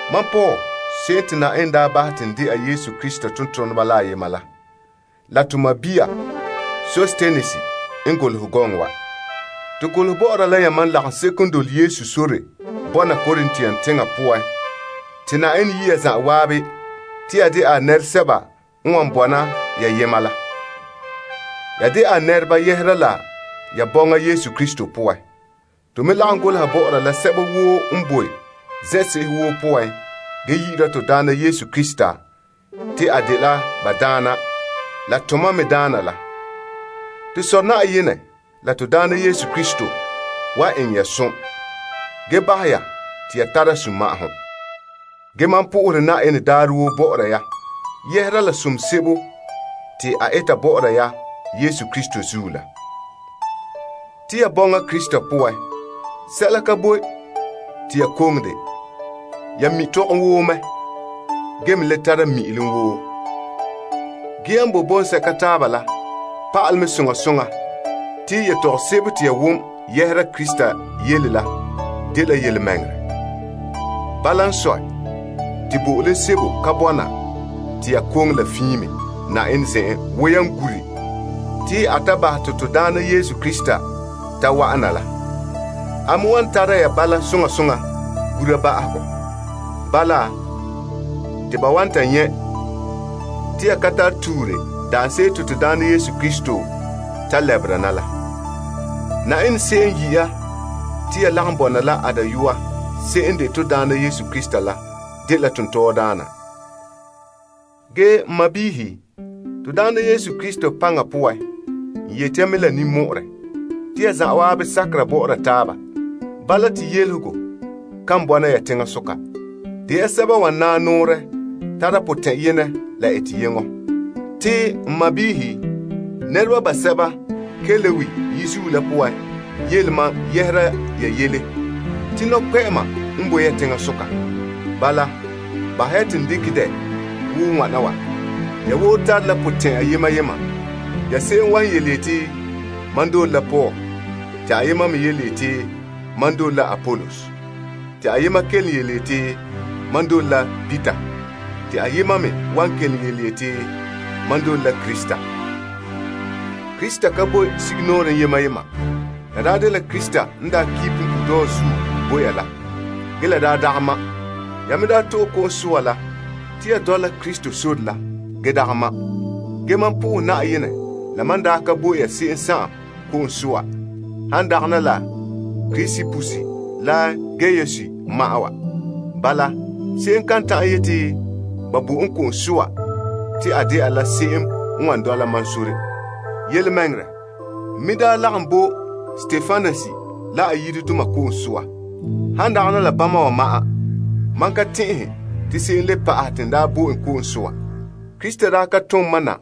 Mam Paul se'em te Yenɛ daa bahɛ te n de'a Yesu Krista tontoneba la ayema la la to sɔɔn Sostenes n golehɛ gɔŋɔ wa. To golehɛ bɔ'ɔra la yamam lagaŋseko n boe Korint teŋa poan te Na'ayenɛ yi' ya zanwaabe te ya de'a a nɛresɛba n wan bɔna ya yema la. Ya de a nɛreba yɛhera la ya bɔŋa Yesu Krista poan. To me lagom golehɛ bɔ'ɔra la sɛba woo n boe zen'se'ehe woo poan, ge yi'ira to Daana Yesu Krista te a dela ba Daana la to mam me Daana la. To Sɔ' Na'ayenɛ la to Daana Yesu Krista wan eŋɛ ya som, ge bahɛ ya te ya tara sunma'ahom. Ge mam sohora Na'ayenɛ daarɛ woo bɔ'ɔra ya yɛhera la som sebo te a eta bɔ'ɔra ya Yesu Krista zuo la. Te ya bɔŋa Krista poan, sɛla ka boe te ya koŋe de. Ya mi' tɔgom woo mɛ, ge me le tara mi'ilom woo. Ge yan boe bɔŋsɛka taaba la pa'alɛ mɛ soŋa soŋa te yetɔgom sebo te ya wom yɛhera Krista yele la dela yelemɛŋɛrɛ. Bala n sɔe, te bo'olom sebo ka bɔna te ya koŋe la fiin me Na'ayenɛ zen'en wo yan gure te a ta bahɛ te to Daana Yesu Krista ta wa'an na la. A me wan tara ya bala soŋa soŋa gura ba'ahegɔ. Bala, te ba wan ta nyɛ' te ya ka tara tuure daanse'ere daarɛ te to Daana Yesu Krista ta lɛbera na la. Na'ayenɛ se'em n yi' ya te ya lagom bɔna la a Dayɔa se'em n de to Daana Yesu Krista la dela tontɔɔdaana. Ge n sɔɔnrɔ, to Daana Yesu Krista paŋa poan, n yeti ya mɛ la ninmɔ'ɔrɛ. Te ya zan'an sakera bɔ'ɔra taaba. Bala, te yelehego kan bɔna ya teŋasoka. De ya sɛba n wan naa nɔɔrɛ tara potɛn'yenɛ. Te n sɔɔnrɔ, nɛreba basɛba Kloe yizuo la poan yele mam yɛhera ya yele te nɔkpɛ'ɛma n boe ya teŋasoka. Bala, bahɛ ya te n dekɛ dɛ wo wana wa. Ya woo tare la potɛn'ya yema yema. Ya se'em wan yeti, Mam dole la Paul, te ayema me yeti, Mam me dole la Apolos, te ayema kelom yeti, Mam dole la Peter, te ayema me wan kelom yeti, Mam dole la Krista. Krista boe la yema yema? Ba daa kpa' la Paul bo ya? Ya daa to'e ko'om soa la Paul yu'urɛ poan? Ge mam pɛngɛ Na'ayenɛ la mam n daa ka bo ya se'em ko'om soa, han dagana la Krispus la Gaius ma'an wa. Bala, se'em kan ta'an yeti ba bo en ko'om soa te a dɛna la se'em n wan dɔla mam sore. Yelemɛŋɛrɛ, n me daa lagom bo Stepanas la a yiredoma ko'om soa. Han dagana la bana wa ma'an, mam ka tɛn'ɛhɛ te se'em le pa'ahɛ te n daa bo en ko'om soa. Krista daa ka tom mam na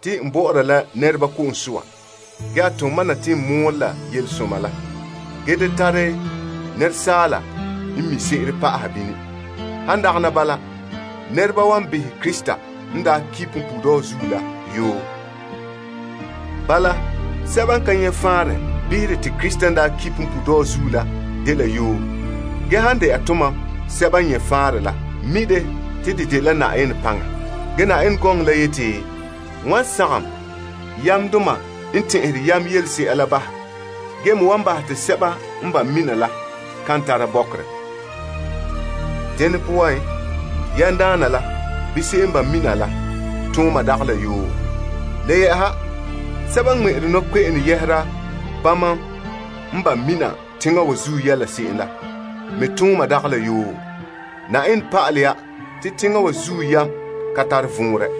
te n bɔ'ɔra la nɛreba ko'om soa, ge n mɔɔla Yelesoma te asaala yam da pa'ahɛ bini bahɛ te Krista kum punpuuredɔɔ zuo la dɛna yoo. Bala, sɛba n ka nyɛ faanrɛ behere te Krista n daa ki punpuuredɔɔ zuo la dela yoo. Ge, han dɛna tomam sɛba n nyɛ faanrɛ la mi' te dɛ dela Na'ayenɛ paŋa. Ge gɔŋɔ la yeti, N wan sagom yamdoma la yam la bahɛ, ge me wan bahɛ te sɛba n behere la kan le nyɛta sɛla. Yamdaana la bɛɛ? Se'em n ba' mina la bɛɛ? Le yɛ'ɛha, sɛba n ŋmɛ'ɛre nɔkpe'ene yɛhera bama n ba' mina teŋa wa zuo yɛla se'em la bɛɛ? Na'ayenɛ pa'alɛ ya te teŋa wa zuo yam ka tare vɔnrɛ.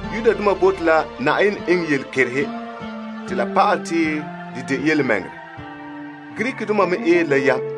Yudoma bote la Na'ayenɛ eŋɛ yelekerehe te la pa'alɛ te a dela yelemɛŋɛrɛ. Greekdoma me eere la yam.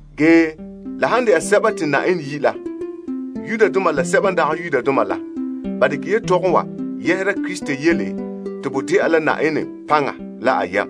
Ge, la han dɛna sɛba te Na'ayenɛ yi' la, Yudoma la Greekdoma la, ba dekɛ yetɔgɔbɔna wa yɛhera Krista yele te bo dɛna la Na'ayenɛ paŋa la a yam.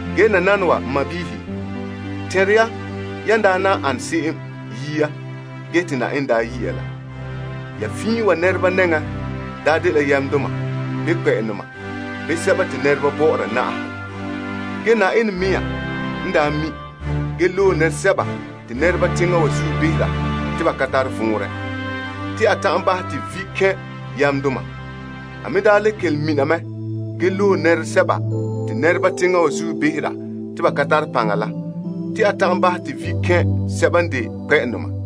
Ge nananawa n sɔɔnrɔ, tɛnra ya yan daa nan an se'em yia ge te Na'ayenɛ daa yi' ya la. Ya fiin wa nɛreba nɛŋan daa dela yamdoma, bii kpɛ'ɛndoma, bii sɛba te nɛreba bɔ'ɔra na'ahegɔ. Ge Na'ayenɛ n loe sɛla te nɛreba teŋa wa zuo behera te la dela gɔɔnɛ te a ta'an bahɛ te vi' kɛn' yamdoma. Enŋa n le loe sɛla n ka tare paŋa teŋa wa zuo te a bahɛ te vi' kɛn' sɛba n de paŋadoma.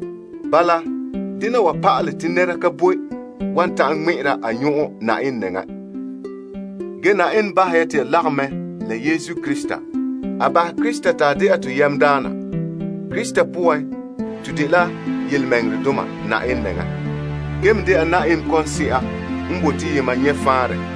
Bala, dena wa pa'ale te nɛra ka boe wan ta'an ŋmɛ'ɛra a nyɔn'ɔn Na'ayenɛ nɛŋan. Ge Na'ayenɛ bahɛ ya te ya lagom mɛ la Yesu Krista. A bahɛ Krista te a dɛna to yamdaana. Krista poan, to dela tontɔɔdoma Na'ayenɛ nɛŋan, gee me dɛna Na'ayenɛ toolom nɛreba bɔna fai.